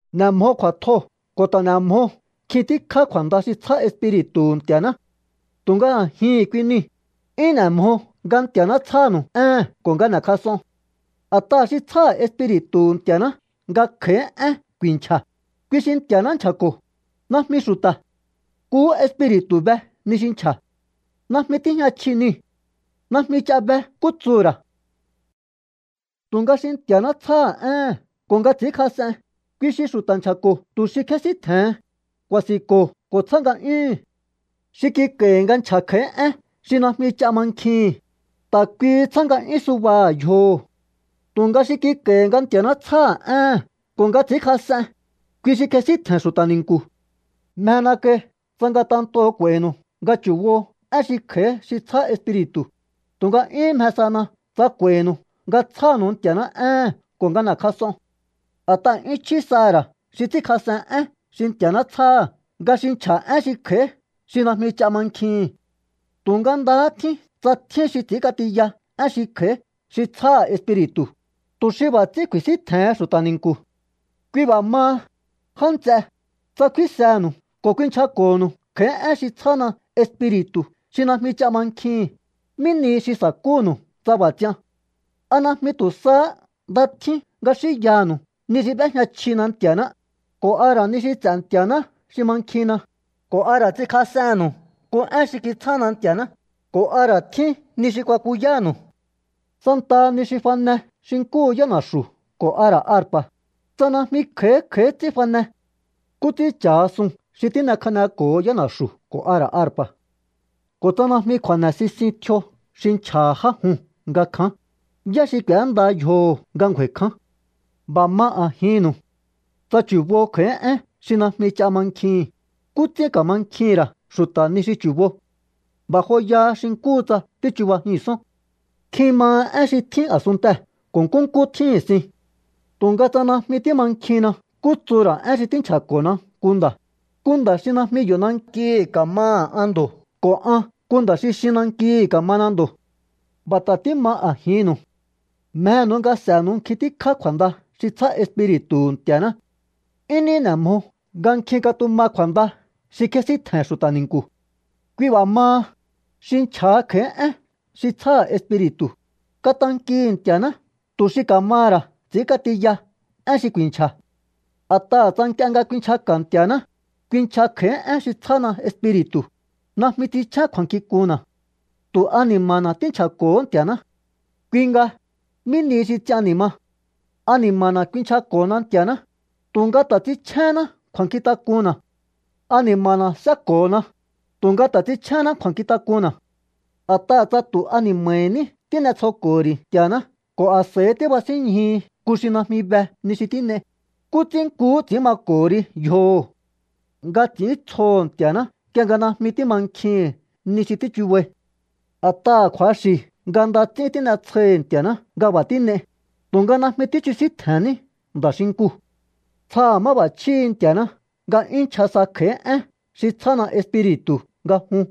N'e̱ mjo kju̱a̱tjoo̱ ko̱ ta̱ n'e̱ mjo nkjin tíkjá kju̱a̱nda xi tsjá Espiri̱tu̱hu̱ Nti̱a̱ná. Tu̱nga a̱jihi̱n kui niu̱, 'yún n'e̱ mjo nga Nti̱a̱ná tsjánu̱u éhe̱n ko̱ nga n'e̱kjas'on. A̱t'aha̱ xi tsjáha̱ Espiri̱tu̱hu̱ Nti̱a̱ná nga kj'a̱í én ku̱i̱nchja̱, kui xi Nti̱a̱ná nchja̱ko̱, najmi xu̱ta̱. Nkuhú Espiri̱tu̱ be ni xi nchja̱. Najmi tíjña chji niu̱. Najmi ch'a be nkú tsuhu̱ ra̱. Tu̱nga xi Nti̱a̱ná tsjáha̱ éhe̱n ko̱ nga ts'i̱ínkjas'en, kui xi xu̱ta̱ nchja̱ko̱ tu̱ xi kjésíntje̱hen, ku̱a̱si̱nko̱ ko̱ tsjá nga'yúhu̱n. Xi kik'a̱i̱hi̱ nga nchja̱ kj'a̱í én xi najmi ch'a mankjihi̱n, ta̱ kuihi tsjá nga'yún subaha̱ yjoho̱. Tu̱nga xi kik'a̱i̱hi̱ nga Nti̱a̱ná tsjáha̱ éhe̱n ko̱ nga ts'i̱ínkjas'en, kui xi kjesíntje̱n xu̱ta̱ ni̱nku̱. Mjena kai tsa ngatentoo̱ k'u̱a̱i̱nu̱u nga chu̱bo én xi kj'a̱í xi tsjá Espiri̱tu̱, tu̱nga 'yúhún mje sana tsa k'u̱a̱i̱nu̱u nga tsjánu̱u Nti̱a̱ná éhe̱n ko̱ nga n'e̱kjas'on. A̱t'aha̱ 'yún chjí saha̱ ra̱ xi ts'ínkjas'en én xi Nti̱a̱ná tsjáha̱ nga xi nchja̱ én xi kj'a̱í xi najmi ch'a mankjihi̱n. Tu̱nga ndahá tjín tsa tjín xi ts'i̱ínk'atiya én xi kj'a̱í xi tsjáha̱ Espiri̱tu̱, tu̱ xi b'a̱ ts'ín ku̱i̱síntje̱hen xu̱ta̱ ni̱nku̱. Kui b'a̱ maha, já nts'e, tsa kfínsenu̱u ko̱ kuinchjako̱nu̱u kj'a̱í én xi tsjána Espiri̱tu̱ xi najmi ch'a mankjihi̱n, ¿mí nihi xi sa̱kúnu̱u tsa b'a̱ ts'ian? ¿A najmi tu̱ sahá nda tjín nga xínyanu̱u ni xi b'éjña chjina Nti̱a̱ná, ko̱ a ra̱ ni xi ts'e̱ Nti̱a̱ná xi mankjinna, ko̱ a ra̱ ts'inkjas'ennu̱u nku én xi kitsjána Nti̱a̱ná, ko̱ a ra̱ tjín ni xi kuakuyánu̱u? Santaha ni xi fane xi nkúhu yána̱xu̱ ko̱ a ra̱ arpa̱, tsa najmi kj'a̱í kj'a̱í ts'ín fane, ¿nkú ts'ín cha̱ha suu̱n xi tín'ekjaneko̱ho yána̱xu̱ ko̱ a ra̱ arpa̱? Ko̱ tsa najmi kju̱a̱ne̱ sisin tjio xi nchja̱ha̱ já juu̱n nga kján, ¿yá xi k'u̱énda yjoho̱ nga ngju̱a̱i̱ kján? B'a̱ ma a̱jinnu̱u. Tsa chu̱bo kj'a̱í én xi najmi ch'a mankjihi̱n, ¿nkú ts'ín ka̱mankjihi̱n ra̱ xu̱ta̱ ni xi chu̱bo? B'a̱ joya xi nkúhu tsa tíchubajihi̱nsón. Nkjin maha én xi tjín a̱sunntee̱ ko̱ nkúnkú tjíhi̱n sin. Tu̱nga tsa najmi tímankjinna nkú tsuhu̱ ra̱ én xi tínchja̱ko̱na nku nda̱, nku nda̱ xi najmi yo̱ nankihi̱ ka̱maha̱ an ndo̱ ko̱ an nku nda̱ xi xin nankihi̱ ka̱mana ndo̱. B'a̱ ta̱ tíma a̱jinnu̱u. Mjenu̱u nga s'e̱nu̱u nkjin tíkjá kju̱a̱nda xi tsjá Espiri̱tu̱hu̱ Nti̱a̱ná. 'Yún ní n'e̱ mjo nga nkjin katuma kju̱a̱nda xi kjénsíntje̱n xu̱ta̱ ni̱nku̱. Kui b'a̱ maha, xi nchja̱ha kj'a̱í én xi tsjáha̱ Espiri̱tu̱, katankihi̱ Nti̱a̱ná tu̱ xi ka̱maha̱ ra̱ ts'ínk'atiya én xi ku̱i̱nchja̱. A̱t'aha̱ tsa nk'ie nga kuinchjaka̱ Nti̱a̱ná, kuinchja kj'a̱í én xi tsjána Espiri̱tu̱, najmi ts'inchjén kju̱a̱nkjink'unna̱. Tu̱ ani̱ma̱na̱ tínchja̱ko̱hó Nti̱a̱ná. Kui nga, ¿mí ni xi ts'ian ni̱ ma? Ani̱ma̱na̱ kuinchjako̱hona Nti̱a̱ná, tu̱nga ta̱ ts'inchjénná kju̱a̱nkjintak'unna̱. Ani̱ma̱na̱ séko̱hona, tu̱nga ta̱ ts'inchjénná kju̱a̱nkjintak'unna̱. A̱t'aha̱ tsa tu̱ ani̱ma̱hi̱ ní tín'etsjoko̱ho̱ ri̱ Nti̱a̱ná ko̱ a̱s'a̱i tíbasínñjuhi nku xi najmi be ni xi tín'ei, ¿nkú ts'ín nkuhú ts'i̱ín mako̱ho ri yjoho̱ nga ts'i̱íntsjoho̱ Nti̱a̱ná nk'ie nga najmi tímankjihi̱n ni xi tíchubai? A̱t'aha̱ kju̱axi̱ nga nda ts'ín tín'etsjoihi̱ Nti̱a̱ná nga b'a̱ tín'ei, tu̱nga najmi tíchjusíntje̱nní nda̱ xinkuu̱. Tsjaha̱ máb'a̱chjíhi̱ Nti̱a̱ná nga 'yún nchja sa kj'a̱í én xi tsjána Espiri̱tu̱ nga jun.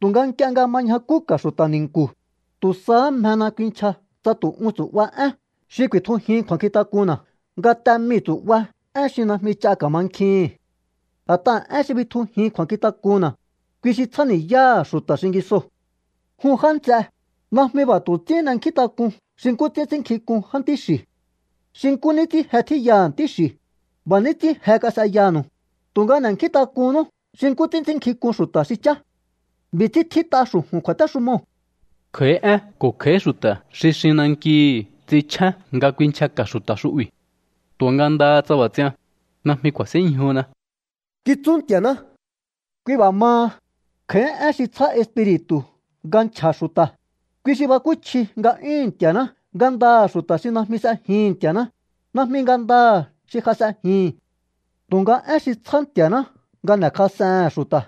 Tu̱nga nk'ie nga ma ñjakúka̱ xu̱ta̱ ni̱nku̱, tu̱ sahá mjena kuinchja tsa tu̱ un tsu̱'ba én xi ku̱i̱tjujin kju̱a̱nkjintak'unna̱ nga te mii̱ tsu̱'ba én xi najmi ch'a ka̱mankjihi̱n. A̱t'aha̱ én xi bitjujin kju̱a̱nkjintak'unna̱, kui xi tsjáni̱yáha̱ xu̱ta̱ xingisoo̱. Jun já nts'e, najmi b'a̱ tu̱ ts'ín n'enkjíntak'un xi nkú ts'ín ts'ínnkjink'un jántí xi̱. Xi nkú ní ts'ín je tjíyaha̱ ntí xi̱, b'a̱ ní ts'ín je kas'eyanu̱u, tu̱nga n'e̱nkjíntak'unnú xi nkú ts'ín ts'ínnkjink'un xu̱ta̱ xi chá. B'i̱ ts'ín tjít'a xu̱ju̱n kju̱a̱téxumoo̱: Kj'a̱í én ko̱ kj'a̱í xu̱ta̱ xi xin nankihi ts'inchjén nga kuinchjaka̱ xu̱ta̱ xu'bi̱. Tu̱nga ndaha tsa b'a̱ ts'ian, najmi ku̱a̱sínñjuna, kitsú Nti̱a̱ná. Kui b'a̱ maha, kj'a̱í én xi tsjá Espiri̱tu̱ nga nchja̱ xu̱ta̱, kui xi bakúchji nga'yúhu̱n Nti̱a̱ná ngandaha̱ xu̱ta̱ xi najmi s'ejihi̱n Nti̱a̱ná, najmi ngandaha̱ xi ja s'ejihi̱n. Tu̱nga én xi tsjá Nti̱a̱ná nga n'e̱kjas'ehe̱n xu̱ta̱,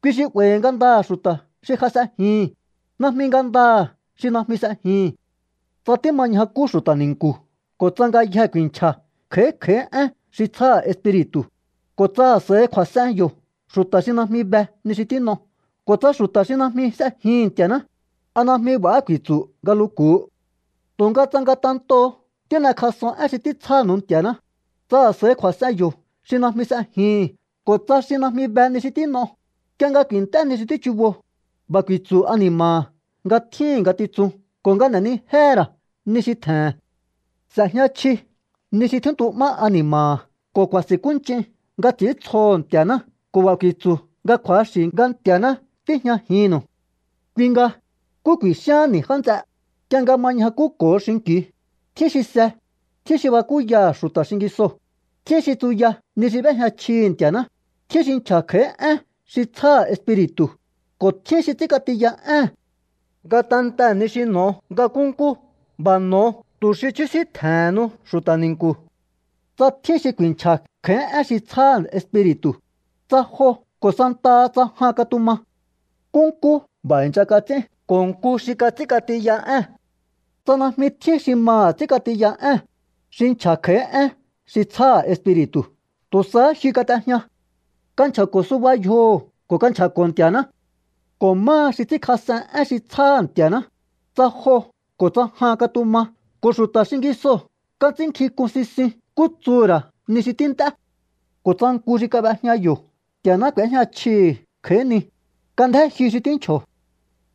kui xi 'ba̱i̱ ngandaha̱ xu̱ta̱ xi ja s'ejihi̱n, najmi ngandaha̱ xi najmi s'ejihi̱n. Tsa tíma ñjakú xu̱ta̱ ni̱nku̱ ko̱ tsa ngayjee̱ ku̱i̱nchja̱ kj'a̱í kj'a̱í én xi tsjáha̱ Espiri̱tu̱, ko̱ tsa a̱s'a̱i kju̱a̱s'en yo̱ xu̱ta̱ xi najmi be ni xi tín'o ko̱ tsa xu̱ta̱ xi najmi s'ejihi̱n Nti̱a̱ná, ¿a najmi b'a̱há ku̱i̱tsu̱ nga luku̱u? Tu̱nga tsa ngatentoo̱ tín'ekjas'on én xi títsjánu̱u Nti̱a̱ná, tsa a̱s'a̱i kju̱a̱s'en yo̱ xi najmi s'ejihi̱n ko̱ tsa xi najmi be ni xi tín'o, nk'ie nga ku̱i̱nt'é ni xi tíchubo, b'a̱ ku̱i̱tsu̱ ani̱ma̱ha̱ nga tjíhi̱n ngatitsun ko̱ nga n'enijéhe̱ ra̱ ni xi tje̱he̱n. S'e̱jña chji ni xi tjíntu'má ani̱ma̱ha̱ ko̱ ku̱a̱si̱nkúnch'in nga ts'i̱íntsjoho̱ Nti̱a̱ná ko̱ b'a̱ ku̱i̱tsu̱ nga kju̱axi̱ nga Nti̱a̱ná tíjñajinnu̱u. Kui nga, ¿nkú ku̱i̱xíaán ni̱, já nts'e? Nk'ie nga ma ñjakúko̱o xinki̱u, tjín xi se, tjín xi bakúyaha̱ xu̱ta̱ xingisoo̱, tjín xi tsuya ni xi b'éjña chjihi̱ Nti̱a̱ná, tjín xi nchja̱ kj'a̱í én xi tsjáha̱ Espiri̱tu̱, ko̱ tjín xi ts'ínk'atiya ée̱n. Ngatentee̱ ni xi n'o̱o nga nkúnkú, b'a̱ n'o̱o tu̱ xi chjúsíntje̱hennu xu̱ta̱ ni̱nku̱. Tsa tjín xi ku̱i̱nchja̱ kj'a̱í én xi tsjáha̱ Espiri̱tu̱, tsa jo ko̱ santaha tsa jan katuma. Nkúnkú b'a̱ i̱ncha kats'ín ko̱ nku xi kats'ínk'atiya ée̱n. Tsa najmi tjín xi maha̱ ts'ínk'atiya ée̱n, xi nchja̱ kj'a̱í én xi tsjáha̱ Espiri̱tu̱ tu̱ sahá jyu kat'ejña. Kanchja̱ko̱ suba yjoho̱ ko̱ kanchja̱ko̱ Nti̱a̱ná. Ko̱ máha xi ts'ínkjas'en én xi tsjáha̱ Nti̱a̱ná, tsa jo ko̱ tsa jan katuma ko̱ xu̱ta̱ xingisoo̱ kats'ínnkjink'un sisin nkú tsuhu̱ ra̱ ni xi tínt'é. Ko̱ tsa nku xi kab'ejña yo̱ Nti̱a̱ná k'u̱éjña chjihi̱ kj'a̱í ni, kandjén jyu xi tínchjo̱.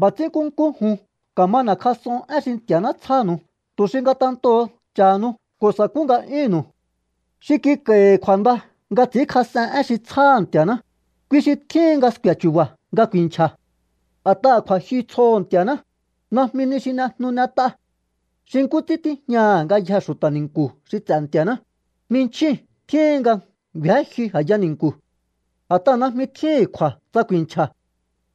B'a̱ ts'ín nkúnkú jun ka̱ma n'e̱kjas'on én xi Nti̱a̱ná tsjánu̱u tu̱ xi ngatentoo̱ cha̱hanu ko̱ sa̱kú nga'yúnnu̱u. Xi kik'a̱i̱hi̱ kju̱a̱nda nga ts'i̱ínkjas'en én xi tsjáha̱ Nti̱a̱ná, kui xi tjíhin nga sku̱e̱ chu̱ba̱ nga ku̱i̱nchja̱. A̱t'aha̱ kju̱a̱jyu tsjoho̱ Nti̱a̱ná, najmi ni xi n'ejnu n'et'a. Xi nkú ts'ín tíjñaha̱ ngayjee̱ xu̱ta̱ ni̱nku̱ xi ts'e̱ Nti̱a̱ná, jminchjíu̱n tjíhin nga ngju̱én jyu a̱ya ni̱nku̱. A̱t'aha̱ najmi tjíhi̱n kju̱a̱ tsa ku̱i̱nchja̱.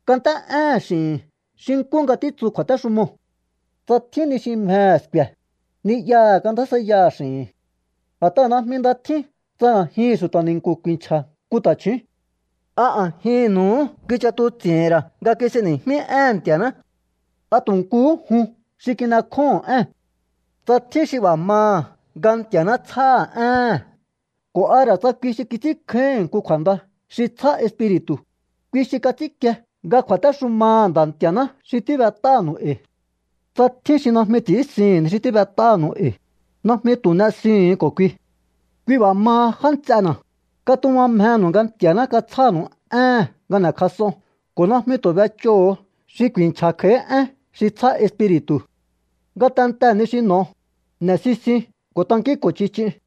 Kant'é'éhe̱n x'i̱hi̱n xi nkú nga títsu kju̱a̱téxumoo̱. Tsa tjín ni xi mjehe̱ sku̱e̱, ni'yaha̱ kandjásjaiyaha̱ x'i̱hi̱n. A̱t'aha̱ najmi nda tjín tsa a̱jihi̱n xu̱ta̱ ni̱nku̱ ku̱i̱nchja̱ nku ta̱chju̱ún. ¿A a̱jinnu̱uhú kich'atuts'i̱hi̱n ra̱ nga kis'eni̱jmí éhe̱n Nti̱aná? ¿A tu̱ nkuhú jun xi kin'ekjóho̱on ée̱n? Tsa tjín xi b'a̱ maha̱ nga Nti̱a̱ná tsjáha̱ éhe̱n ko̱ a ra̱ tsa kui xi kits'ínkjáíhi̱n nku kju̱a̱nda xi tsjá Espiri̱tu̱, kui xi kats'ínkie nga kju̱a̱téxumaha̱ Nda̱ Nti̱a̱ná xi tíb'et'ánu̱u e̱i̱. Tsa tjín xi najmi ts'i̱ínsihi̱n ni xi tíb'et'ánu̱u e̱i̱, najmi tu̱ n'esihu̱un ko̱ kui. Kui b'a̱ maha, já nts'ena̱, katuma mjenu̱u nga Nti̱a̱ná katsjánu̱u éhe̱n nga n'e̱kjas'on ko̱ najmi tu̱ b'ech'óho̱o xi ku̱i̱nchja̱ kj'a̱í én xi tsjá Espiri̱tu̱. Ngatentee̱ ni xi n'o̱o, n'e̱sisiun ko̱ tankínko̱ ch'ich'iun.